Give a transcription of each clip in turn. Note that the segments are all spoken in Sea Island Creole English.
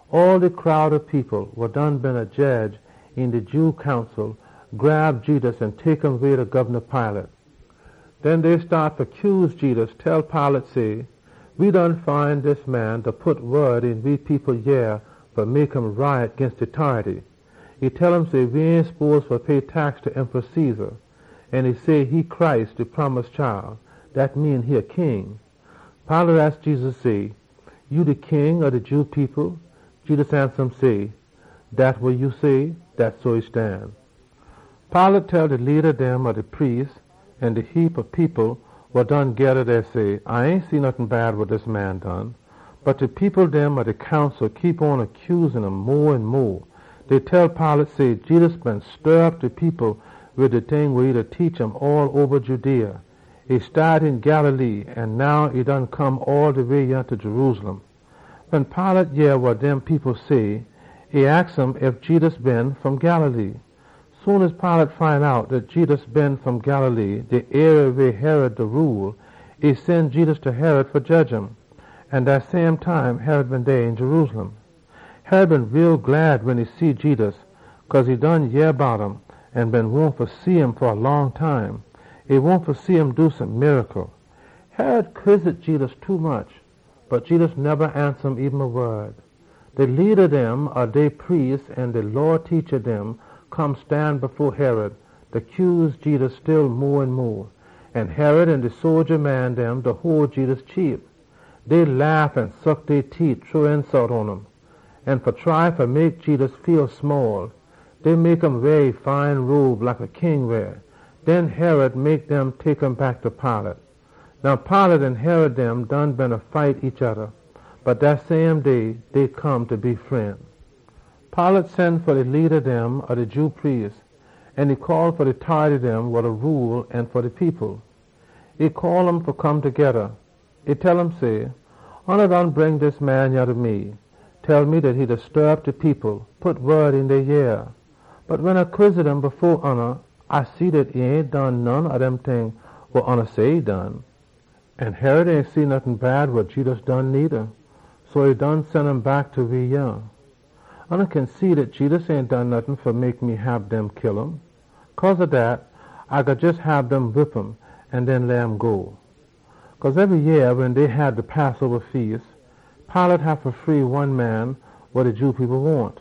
All de crowd ob people wa beena jedge een de Jew Council grab hole ta Jedus an tek um way ta Gobna Pilate. Den dey staat fa cuse Jedus, tell Pilate say, “We done find dis man da pit wod een we people yea fa mek um riot ginst de tority. E tell um say we ain spose fa pay tax ta Caesar. An e say e de Messiah. Dat mean e a king.” Pilate aks Jedus say, “Ya de king ob de Jew people?” Jedus ansa um say, “Dat wa ya say. Dat so e stan.” Pilate tell de leada dem ob de priest dem an de heapa people wa done geda dey say, “A ain see nottin bad wa dis man done.” Bot de people dem ob de Council keep on da cuse um mo an mo. Dey tell Pilate say, “Jedus beena stir op de people wid de ting wa e da laan um all oba Judea. E staat een Galilee, an now e done come all de way yah ta Jerusalem.” Wen Pilate yeh wa dem people say, e aks um ef Jedus been fom Galilee. Soon as Pilate find out dat Jedus been fom Galilee, de arie weh Herod da rule, e sen Jedus ta Herod fa jedge um. An dat same time Herod been dey een Jerusalem too. Herod been too glad wen e see Jedus, cause e done yeh bout um an been wahn fa shim fa a long time. E been wahn fa shim do some miracle. Herod quizzit Jedus tommuch, bot Jedus neba ansa um eben a wod. De leada dem ob dey priest dem an de Law teacha dem come stan fo Herod, da cuse Jedus still mo an mo. An Herod an e sodja dem hole Jedus cheap. Dey laugh an suck dey teet, shrow insult pon um. An dey mek um weah a fine robe, like a king weah. Den Herod sen Jedus back ta Pilate. Now Pilate an Herod dem done beena fight each oda, bot dat same day, dey come fa be fren. Pilate sen fa de leada dem ob de Jew priest dem, an e call fa de tority dem wa da rule, an fa de people. E call um all fa come togeda. E tell um say, “Oona done bring dis man yah ta me, tell me dat e da stir op de people, pit wod een dey yea. Bot wen A quizzit um fo oona, A see dat e ain done none ob dem ting wa oona say e done. An Herod ain see nottin bad wa Jedus done needa, so e sen um back ta we yah. Oona kin see dat Jedus ain done nottin fa mek me hab dem kill um. Cause ob dat, A gwine jes hab dem whip um an den leh um go.” [ Cause ebry yeah wen dey hab de Passoba feas, Pilate haffa free one man wa de Jew people wahn.]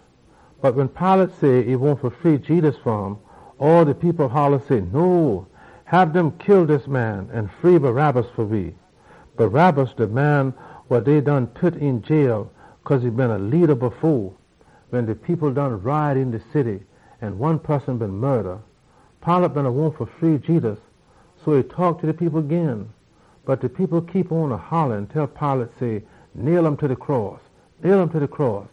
Bot wen Pilate say e wahn fa free Jedus fa um, all de people holla say, “No. Kill dis man an free Barabbas fa we!” (Barabbas de man wa dey been pit een de jailhouse cause e been a leada wen de people been riot een de city an one poson been git kill.) Pilate been wahn fa free Jedus, so e taak ta de people gin. Bot de people holla, tell Pilate say, “Nail um ta de cross! Nail um ta de cross!”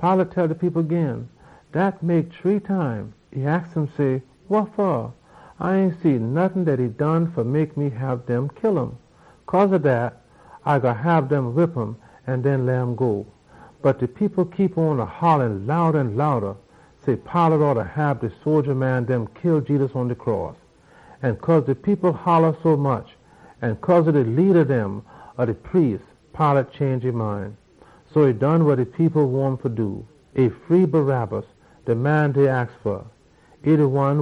Pilate tell de people gin. Dat mek shree time. E aks um say, “Wa fa? A ain see nottin dat e done fa mek me hab dem kill um! Cause ob dat, A gwine hab dem whip um an den leh um go.” Bot de people beena holla mo an mo, say Pilate oughta hab e sodja dem kill Jedus pon de cross. An cause de people holla sommuch an cause ob de leada dem ob de priest dem, e change e mind. So Pilate done wa de people been wahn um fa do. E free Barabbas, de man dey aks fa,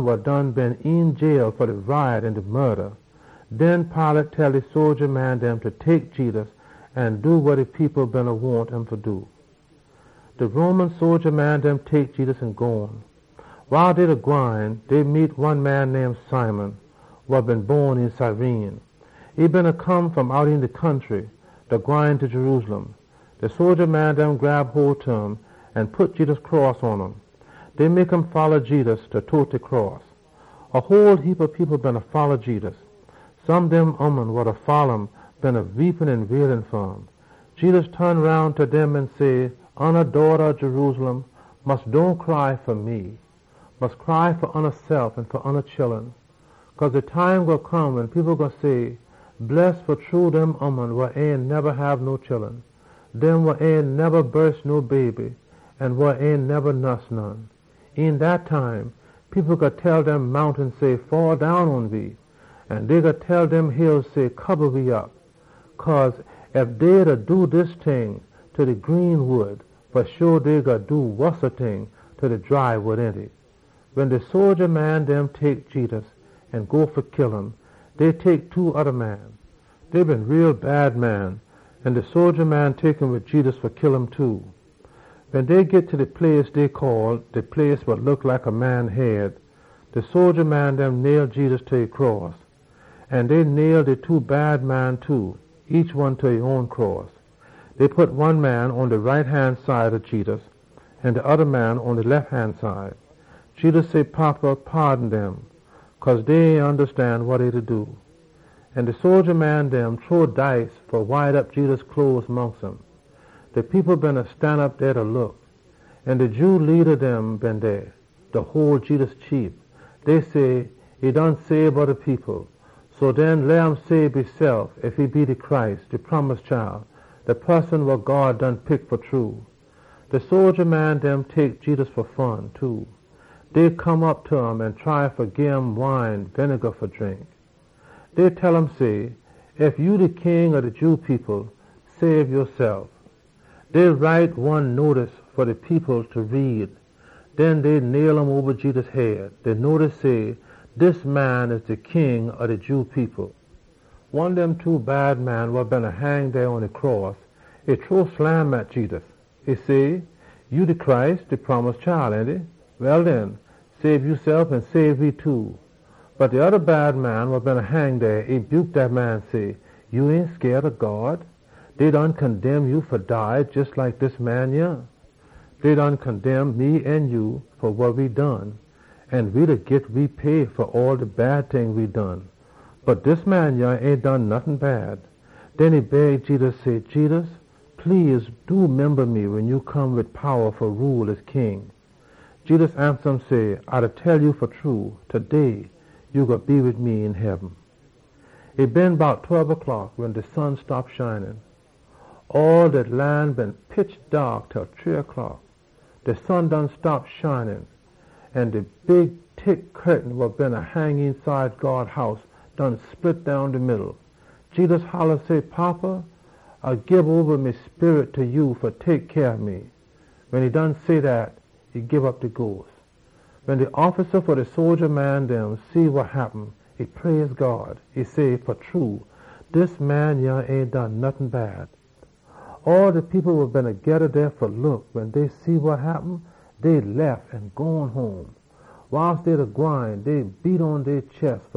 wa been een de jailhouse fa de riot an fa kill somebody. Den Pilate tell e sodja dem fa tek Jedus an do wa de people been wahn um fa do. De Roman sodja dem tek Jedus an gone. Wiles dey beena gwine, dey meet one man name Simon, wa been bon een Cyrene. E beena come fom out een de country, da gwine ta Jerusalem. De sodja dem grab hole ta um an pit Jedus cross pon um. Dey mek um folla Jedus, da tote de cross. A whole heapa people beena folla Jedus. Some dem ooman wa beena folla um beena weep an wail fa um. Jedus ton roun ta dem an say, “Oona daughta ob Jerusalem, mus dohn cry fa me! Mus cry fa oonasef an fa oona chullun. Cause de time gwine come wen people gwine say, ‘Bless fa true dem ooman wa ain neba hab no chullun, dem wa ain neba bon no baby an wa ain neba nuss none!’ Een dat time, people gwine tell de mountain say, ‘Faddown pon we!’ An dey gwine tell de hill say, ‘Kiba we op!’ Cause ef dey da do dis ting ta de green wood, fa sho dey gwine do wossa ting ta de dry wood, ainty?” Wen de sodja dem tek Jedus an go fa kill um, dey tek two oda bad man fa kill wid Jedus too. Wen dey git ta de place dey call “De place wa look like a man head,” de sodja dem nail Jedus ta e cross. An dey nail de two bad man too, each pon e own cross. Dey pit one man pon de right han side ob Jedus an de oda man pon e lef han side. Jedus say, “Fada, paadon dem, cause dey ain ondastan wa dey da do.” An de sodja dem shrow dice fa wide op Jedus cloes mongst um. De people beena stanop dey da look, an de Jew leada dem been dey, da hole Jedus cheap. Dey say, “E sabe oda people. So den, leh um sabe esef, ef e de Messiah wa God done pick fa true!” De sodja dem hole Jedus cheap too. Dey come op ta um an try fa gim wine winega fa drink. Dey tell um say, “Ef ya de king ob de Jew people, sabe yasef!” Dey write de chaage ginst Jedus fa de people fa read, an dey nail um oba Jedus head. De chaage say, DIS MAN YAH DE KING OB DE JEW PEOPLE. One dem two bad man wa beena hang dey pon e cross, e shrow slam at Jedus. E say, “Ya de Messiah, ainty? Well den, sabe yasef an sabe we too!” Bot de oda bad man wa beena hang dey, e buke dat man say, “Ya ain scaid ob God? Dey done condemn ya fa dead jes like dis man yah. Dey condemn we fa wa we done, an we da git we pay fa all de bad ting dem we done. Bot dis man yah ain done nottin bad.” Den e beg Jedus say, “Jedus, please do, memba me wen ya come fa be King!” Jedus ansa um say, “A da tell ya fa true, taday ya gwine be wid me een heaben.” E been bout tweb o’clock wen all dat lan ton pitch daak til shree o’clock. De sun stop fa shine, an de big tick curtain wa beena hang eenside God House split down de middle. Jedus holla say, “Fada, A gii oba me sperit ta ya fa tek cyah ob me!” Wen e done say dat, e dead. Wen de offisa fa de sodja dem see wa happen, e praise God. E say, “Fa true, dis man yah ain done nottin bad.” All de people wa beena geda dey fa look, wen dey see wa happen, dey lef an gone home. Wiles dey beena gwine, dey beat pon dey chest.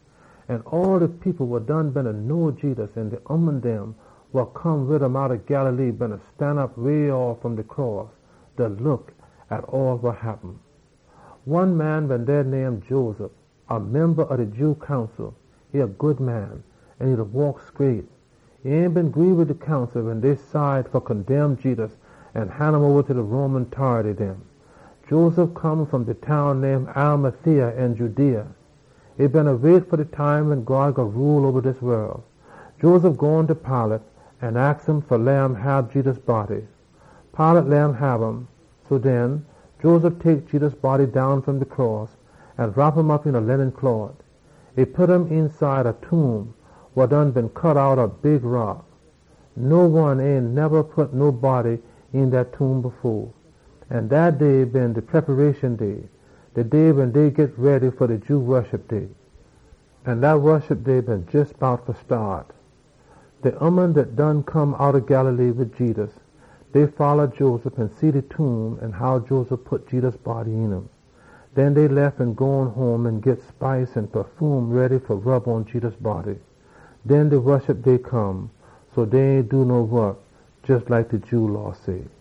An all de people wa been know Jedus, an de ooman dem wa come wid um outta Galilee, beena stanop way off fom de cross, da look pon all wa happen. One man been dey name Joseph, a memba ob de Jew Council. E been a good man an e beena waak scraight. E ain been gree wid de Council wen dey cide fa condemn Jedus an han um oba ta de Roman tority dem. Joseph come fom de town name Arimathea een Judea. E beena wait fa de time wen God gwine rule oba dis wol. Joseph gone ta Pilate an aks um fa leh um hab Jedus body, an Pilate leh um hab um. So den, Joseph tek Jedus body down fom de cross an wrop um op een a linen closs. E pit um eenside a tomb wa done been cut outta a big rock. Nobody ain neba been pit een dat tomb fo dat. An dat day been de Preparation Day, wen dey git ready fa de Jew Woshup Day. An de Woshup Day been jes bout fa staat. De ooman dem dat been come outta Galilee wid Jedus, dey folla Joseph an see de tomb an how Joseph pit Jedus body een um. Den dey lef an gone home an git spice an pafume ready fa rub pon Jedus body. Wen de Woshup Day come, dey ain do no wok, jes like de Jew Law say.